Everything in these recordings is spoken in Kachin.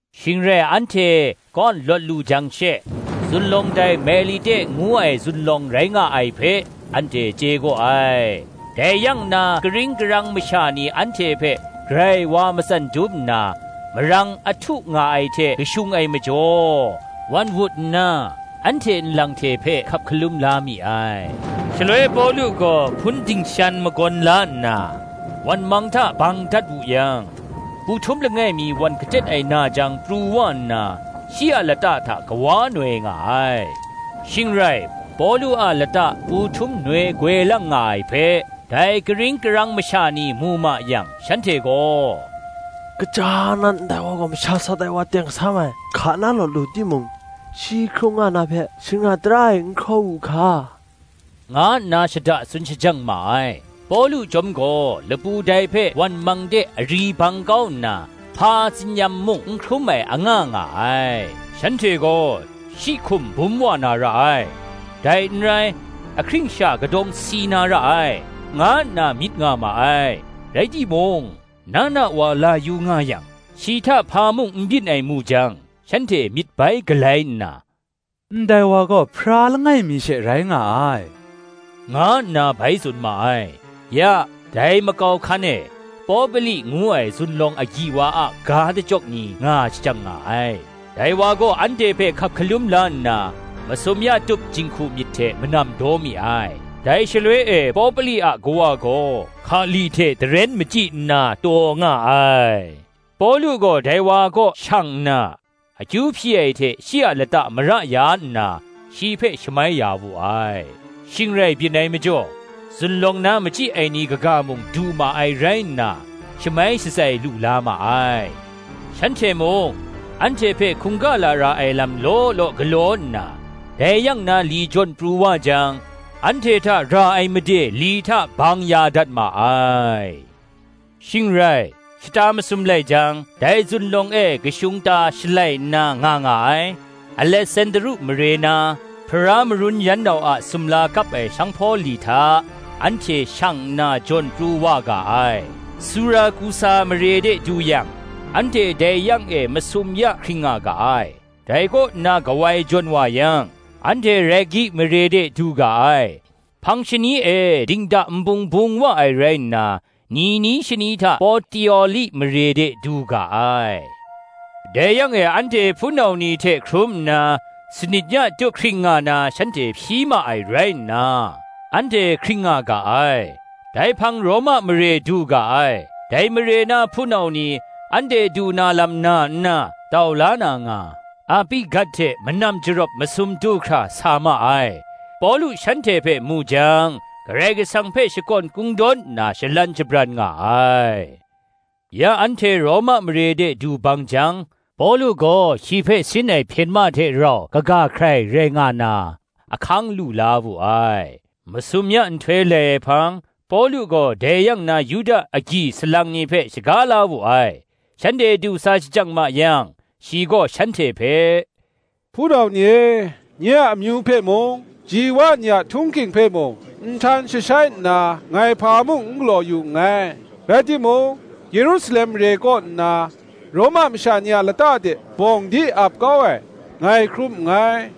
Shing rai anhte, kaw lawt lu jang she, zunlawng dai Melite ngu ai zunlawng rai nga ai hpe, anhte chye gaw ai. Dai yang na karing karang masha ni anhte hpe grai wa matsan dum nna, marang a htu nga ai hte kashung ai majaw, wan wut nna, anhte nlang hte hpe hkap hkalum la mi ai. Shaloi Pawlu gaw hpun dingshan magawn la nna, wan mang hta bang dat wu yang, pu htum langai mi wan kahtet ai na jang pru wa nna, shi a lata hta kawa noi nga ai. Shing rai, Pawlu a lata pu htum noi goi lang nga ai hpe, dai karing karang masha ni mu ma yang, shanhte gaw, “Gaja nan, ndai wa gaw masha sat ai wa teng sam ai; hka na lawt lu timung, shi hkrung nga na hpe, Shingra tara e n hkraw wu hka,” nga nna shada tsun shajang ma ai. Pawlu chyawm gaw lapu dai hpe wan mang de ari bang kau nna, hpa tsin-yam mung n hkrum ai anga nga ai. Shanhte gaw, shi hkum bum wa na ra ai, dai n rai, ahkring sha kadawng si na ra ai, nga nna myit nga ma ai, rai timung, na na wa la yu nga yang, shi hta hpa mung n byin ai mu jang, shanhte myit bai galai nna, ndai wa gaw Hpara langai mi she rai nga ai, nga nna bai tsun ma ai. Ya, dai makau hkan e, Popli ngu ai zunlawng agyi wa a ga dachyawk ni nga shajang nga ai: dai wa gaw anhte hpe hkap hkalum la nna, masum ya tup jinghku myit hte manam daw mi ai. Dai shaloi e Popli a kawa gaw hkali hte daren machyi nna taw nga ai; Pawlu gaw dai wa kaw shang nna, akyu hpyi ai hte shi a lata mara ya nna, shi hpe shamai ya wu ai. Shing rai byin ai majaw, zunlawng na machyi ai ni kaga mung du ma ai rai nna, shamai shatsai lu la ma ai: shanhte mung, anhte hpe hkungga lara ai lam law law galaw nna, dai yang na li jawn pru wa jang, anhte hta ra ai made li hta bang ya dat ma ai. Shing rai, shata masum lai jang, dai zunlawng e kashung ta shalai nna nga nga ai, Alesandru mare na, Hpara marun yan nau a sumla kap ai sanghpaw li hta anhte shang nna jawn pru wa ga ai. Surakusa mare de du yang, anhte dai yang e masum ya hkring nga ga ai. Dai kaw nna kawai jawn wa yang, anhte Regi mare de du ga ai: hpang shani e dingda nbung bung wa ai rai nna, ni ni shani hta Potioli mare de du ga ai; dai yang e anhte hpunau ni hte hkrum nna, sanit ya tup hkring nga na shanhte hpyi ma ai rai nna, anhte hkring nga ga ai: dai hpang Roma mare du ga ai. Dai mare na hpunau ni, anhte du na lam na nna, tau la na nga, Api gat hte Manam Jarawp masum du hkra sa ma ai; Pawlu shanhte hpe mu jang, Karai Kasang hpe shakawn kungdawn nna shalan shabran nga ai. Ya anhte Roma mare de du bang jang, Pawlu gaw shi hpe sin ai hpyen ma hte rau kaga hkrai rai nga na, ahkang lu la wu ai. Masum ya nhtoi lai ai hpang, Pawlu gaw dai yang na Yuda agyi salang ni hpe shaga la wu ai: shanhte du sa shajang ma yang, shi gaw shanhte hpe, “Hpunau ni e, nye a amyu hpe mung, ji wa ni a htung hking hpe mung, nhtan jashai nna, ngai hpa mung n galaw yu nngai; rai timung Yerusalem mare kaw nna, Roma masha ni a lata de bawng di ap kau ai, ngai hkrum nngai: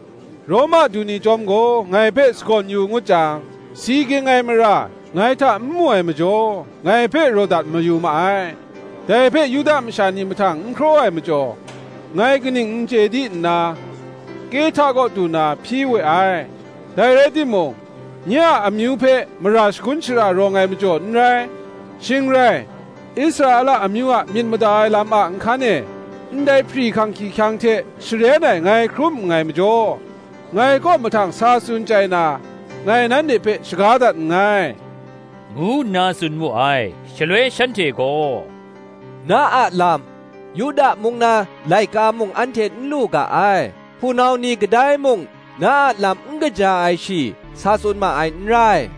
Roma du ni chyawm gaw ngai hpe sagawn yu ngut jang, si ging ai mara ngai hta n mu ai majaw, ngai hpe raw dat mayu ma ai. Dai hpe Yuda masha ni mahtang n hkraw ai majaw, ngai kaning n chye di nna, Kehta kaw du na hpyi we ai: dai rai timung, nye a amyu hpe mara shagun shara rawng ai majaw n rai. Shing rai, Israela amyu a myit mada ai lam a nhkan e, ndai hpri hkang hkyihkyang hte sharen ai ngai hkrum nngai majaw, ngai kaw mahtang sa tsun chyai na, ngai nanhte hpe shaga dat nngai,” ngu nna tsun mu ai. Shaloi shanhte gaw, “Na a lam, Yuda mung na laika mung anhte n lu ga ai; hpunau ni kadai mung na a lam n kaja ai shi sa tsun ma ai n rai.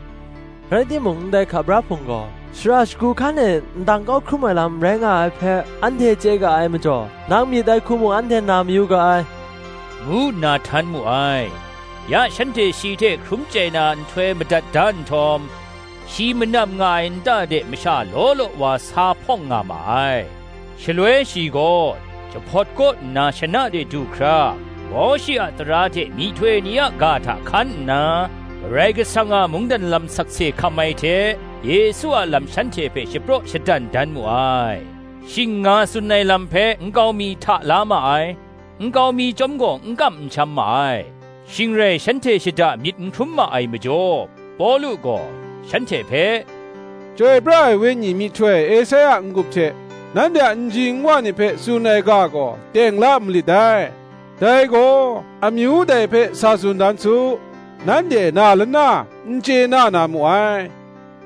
Rai timung, ndai hka bra Hpung gaw, shara shagu hkan e ndang kau hkrum ai lam rai nga ai hpe, anhte chye ga ai majaw, nang myit ai hku mung anhte na mayu ga ai,” ngu nna htan mu ai. Ya shanhte shi hte hkrum chyai na nhtoi madat da nhtawm, shi manam nga ai nta de masha law law wa sa hpawng nga ma ai: shaloi shi gaw, jahpawt kaw nna shana de du hkra, Mawshe a tara hte myihtoi ni a ga hta hkan nna, Karai Kasang a mungdan lam sakse hkam ai hte, Yesu a lam shanhte hpe shapraw shadan dan mu ai. Shing nga tsun ai lam hpe nkau mi hta la ma ai; nkau mi chyawm gaw n kam n sham ma ai. Shing rai shanhte shada myit n hkrum ma ai majaw, Pawlu gaw, shanhte hpe, “Chyoi pra ai Wenyi myihtoi Esaia a n-gup hte nanhte a nji nwa ni hpe tsun ai ga gaw teng la malit dai: dai gaw, ‘Amyu dai hpe sa tsun dan su, Nanhte na lana n chye na na mu ai;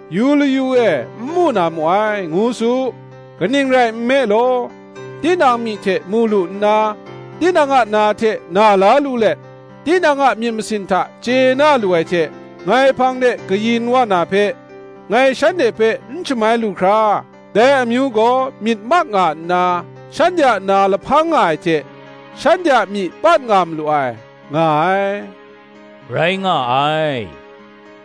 Yu layu e, n mu na mu ai, ngu su. Kaning rai nme law, tinang myi hte mu lu nna, Tinang a na hte na la lu let, Tinang a myit masin hta chye na lu ai hte Ngai hpang de kayin wa na hpe; Ngai shanhte hpe n shamai lu hkra, Dai amyu gaw myit mak nga nna, Shanhte a na lahpang nga ai hte, Shanhte a myi pat nga malu ai,' nga ai, rai nga ai.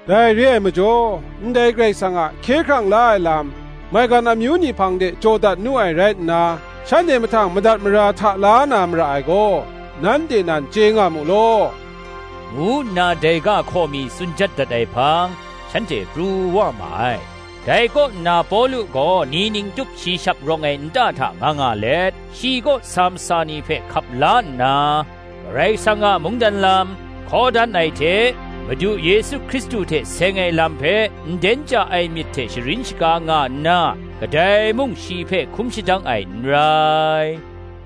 Dai re ai majaw, ndai Karai Kasang a hkye hkrang la ai lam, maigan amyu ni hpang de jaw dat nu ai rai nna, shanhte mahtang madat mara hta la na mara ai gaw, nanhte nan chye nga mu law,” ngu nna dai ga hkaw mi tsun jat dat ai hpang, shanhte pru wa ma ai. Dai kaw nna Pawlu gaw ni ning tup shi shap rawng ai nta hta nga nga let, shi kaw sa masa ni hpe hkap la nna, Karai Kasang a mungdan lam, hkaw dan ai hte, Madu Yesu Hkristu hte seng ai lam hpe nden ja ai myit hte sharin shaga nga nna, kadai mung shi hpe hkum shadang ai n rai.